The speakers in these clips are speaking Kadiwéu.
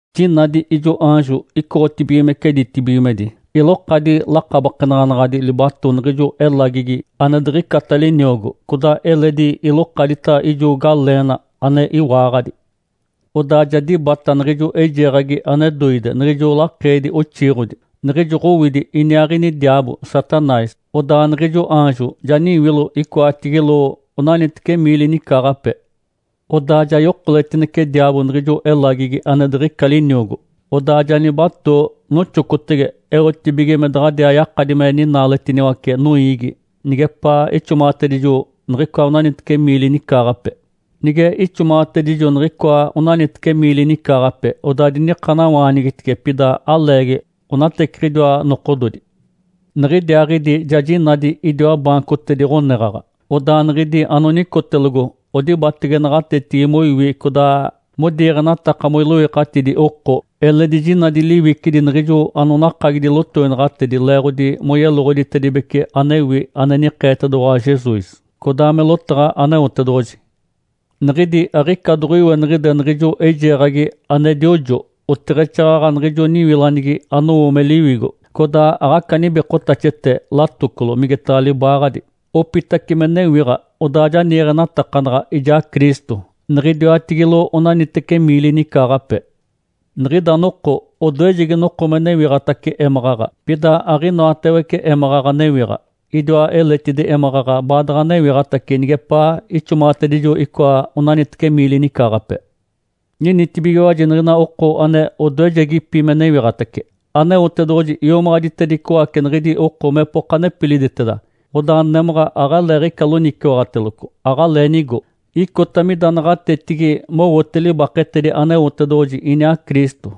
Jinadi ijo aanjo icoɡ̶otibigimece ditibigimedi, ilokadi lakabakenaɡ̶anaɡ̶adi libato niɡ̶ijo elagigi ane diɡ̶icata liniogo, codaa eledi ilokadita ijo galeena ane iwaaɡ̶adi. Odaa ja dibata niɡ̶ijo eijeeɡ̶agi ane doide, niɡ̶ijo lakeedi oxiiɡ̶odi, niɡ̶ijo Ǥowidi iniaaɡ̶ini diaabo, Satanás. Odaa niɡ̶ijo aanjo ja niwilo icoatigilo onaniteci miili nicaaɡ̶ape. Odaa ja yokoletinece diaabo niɡ̶ijo elagigi ane diɡ̶ica liniogo, odaa ja nibatoo, noxocotege, eotibige me daɡ̶adiaa yakadi me ninaaletiniwace noiigi nigepaa ixomaɡ̶atedijo niɡ̶icoa onaniteci miili nicaaɡ̶ape. Nige ixomaɡ̶atedijo niɡ̶icoa onaniteci miili nicaaɡ̶ape, odaa dinikanawaanigitice, pida aleegi, onateciɡ̶idiwa nokododi. Niɡ̶idiaaɡ̶idi ja jinadi idiwa baancotedi ɡ̶oneɡ̶aɡ̶a. Odaa niɡ̶idi anonicotelogo odibatege naɡ̶atetigi moiwi codaa modiiɡ̶enataka moiloikatidi oko. Eledi jinadi liwicidi niɡ̶ijo anonakagidi lotoinaɡ̶atedi leeɡ̶odi moyeloɡ̶oditibece anewi ane nikeetedoɡ̶owa Jesus, codaa me lotaɡ̶a Aneotedoɡ̶oji. Niɡ̶idi aɡ̶ica doɡ̶oiweniɡ̶ide niɡ̶ijo eijeeɡ̶agi ane diojo, oteɡ̶exaaɡ̶aɡ̶a niɡ̶ijo niwilanigi anowo me liwigo, codaa aɡ̶aca nibikotaxete latocolo migetaɡ̶a libaaɡ̶adi. Opitace me newiɡ̶a, odaa ja niiɡ̶enatakanaɡ̶a ijaa Cristo, niɡ̶idiwatigilo onaniteci miili nicaaɡ̶ape. Niɡ̶ida noko, odoejegi noko me newiɡ̶atace émaɡ̶aɡ̶a, pida aɡ̶inoatawece émaɡ̶aɡ̶a newiɡ̶a. Idiwa eletidi émaɡ̶aɡ̶a baadaɡ̶a newiɡ̶atace nigepaa ixomaɡ̶atedijo icoa onaniteci miili nicaaɡ̶ape. Ninitibigiwaji niɡ̶ina oko ane odoejegipi me newiɡ̶atace. Aneotedoɡ̶oji iomaɡ̶aditedicoace niɡ̶idi oko mepoka nepiliditeda. Odaa némaɡ̶a aɡ̶aleeɡ̶ica loniciwaɡ̶ateloco, aɡ̶alee nigo. Icota mida naɡ̶atetigi mowote libaketedi Aneotedoɡ̶oji iniaa Cristo.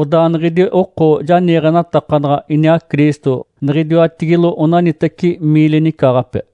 Odaa niɡ̶idi oko ja niiɡ̶enatakanaɡ̶a iniaa Cristo niɡ̶idiwatigilo onaniteci miili nicaaɡ̶ape.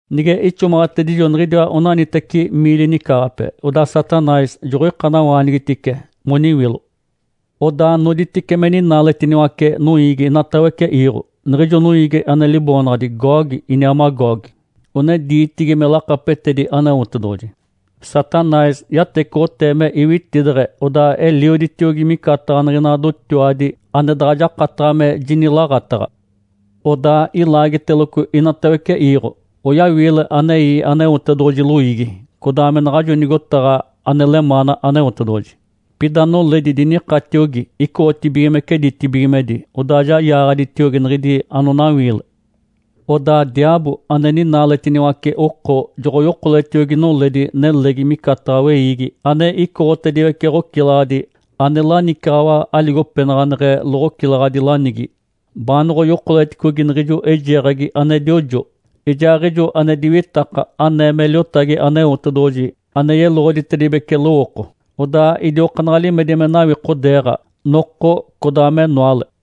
Nige ixomaɡ̶atedijo niɡ̶idiwa onaniteci miili nicaaɡ̶ape, odaa Satanás joɡ̶oikanawaanigitice moniwilo. Odaa noditice me ninaaletiniwace noiigi inatawece iiɡ̶o, niɡ̶ijo noiigi ane liboonaɡ̶adi Gogue iniaa Magogue (one diitigi me lakapetedi Aneotedoɡ̶oji). Satanás yatecoɡ̶otee me iwitideɡ̶e, odaa elioditiogi micataɡ̶a niɡ̶ina dotiwadi, ane daɡ̶a jakataɡ̶a me jinilaaɡ̶ataɡ̶a. Odaa ilaagiteloco inatawece iiɡ̶o, oyawiile anei Aneotedoɡ̶oji loiigi, codaa me naɡ̶ajo nigotaɡ̶a ane lemaana Aneotedoɡ̶oji. Pida noledi dinikatiogi icoɡ̶otibigimece ditibigimedi, odaa yaaɡ̶aditiogi niɡ̶idi anonawiile. Odaa diaabo ane ninaaletiniwace oko joɡ̶oyokoletiogi noledi nelegi micataɡ̶a weiigi ane icoɡ̶otediwece ɡ̶ocilaɡ̶adi ane lanicaɡ̶awa aligopenaɡ̶aneɡ̶e loɡ̶ocilaɡ̶adi lanigi baanoɡ̶oyokoleticogi niɡ̶ijo eijeeɡ̶agi ane diojo, ijaaɡ̶ijo ane diwitaka anee me liotagi Aneotedoɡ̶oji ane yeloɡ̶oditedibece lowooko. Odaa idiokaanaɡ̶a limedi me nawikodeeɡ̶a, noko codaa menoale.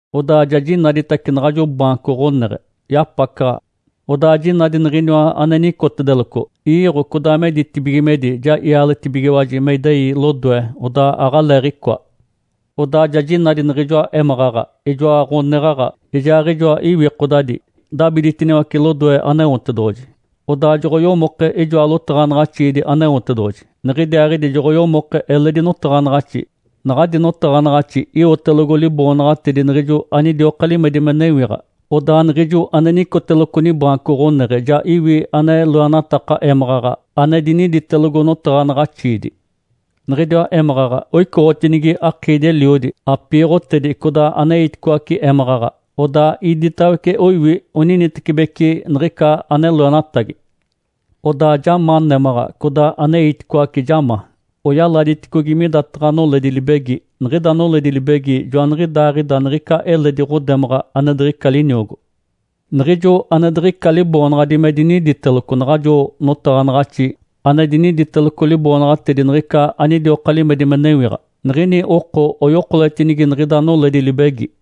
Odaa ja jinaditace naɡ̶ajo baanco ɡ̶oneɡ̶e, yapacaɡ̶a. Odaa jinadi Niɡ̶iniwa ane nicotedeloco. Iiɡ̶o codaa me ditibigimedi ja ialetibigiwaji me idei lodoe, odaa aɡ̶aleeɡ̶icoa. Odaa ja jinadi niɡ̶ijoa émaɡ̶aɡ̶a, ijoa ɡ̶oneɡ̶aɡ̶a, ijaaɡ̶ijoa iwikodadi, dabiditiniwace lodoe Aneotedoɡ̶oji. Odaa joɡ̶oyomoke ijoa lotaɡ̶anaɡ̶axiidi Aneotedoɡ̶oji. Niɡ̶idiaaɡ̶idi joɡ̶oyomoke eledi notaɡ̶anaɡ̶axi, naɡ̶adi notaɡ̶anaɡ̶axi iwotelogo liboonaɡ̶atedi niɡ̶ijo anidioka limedi me newiɡ̶a. Odaa Niɡ̶ijoa ane nicoteloco nibaanco ɡ̶oneɡ̶e ja iwi ane loenataka émaɡ̶aɡ̶a ane diniditelogo notaɡ̶anaɡ̶axiidi. Niɡ̶idiwa émaɡ̶aɡ̶a oicoɡ̶otinigi akiidi-eliodi, apiiɡ̶otedi, codaa aneiticoace émaɡ̶aɡ̶a. Odaa iditawece oiwi oninitecibeci niɡ̶ica ane loenatagi. Odaa ja ma némaɡ̶a codaa aneiticoace ja ma, oyaladiticogi midataɡ̶a noledi libegi. Niɡ̶ida noledi libegi joaniɡ̶idaaɡ̶ida niɡ̶ica eledi ɡ̶odemaɡ̶a ane diɡ̶ica liniogo. Niɡ̶ijo ane diɡ̶ica liboonaɡ̶adi me diniditeloco naɡ̶ajo notaɡ̶anaɡ̶axi ane diniditeloco liboonaɡ̶atedi niɡ̶ica anidioka limedi me newiɡ̶a, niɡ̶ini oko oyokoletinigi niɡ̶ida noledi libegi.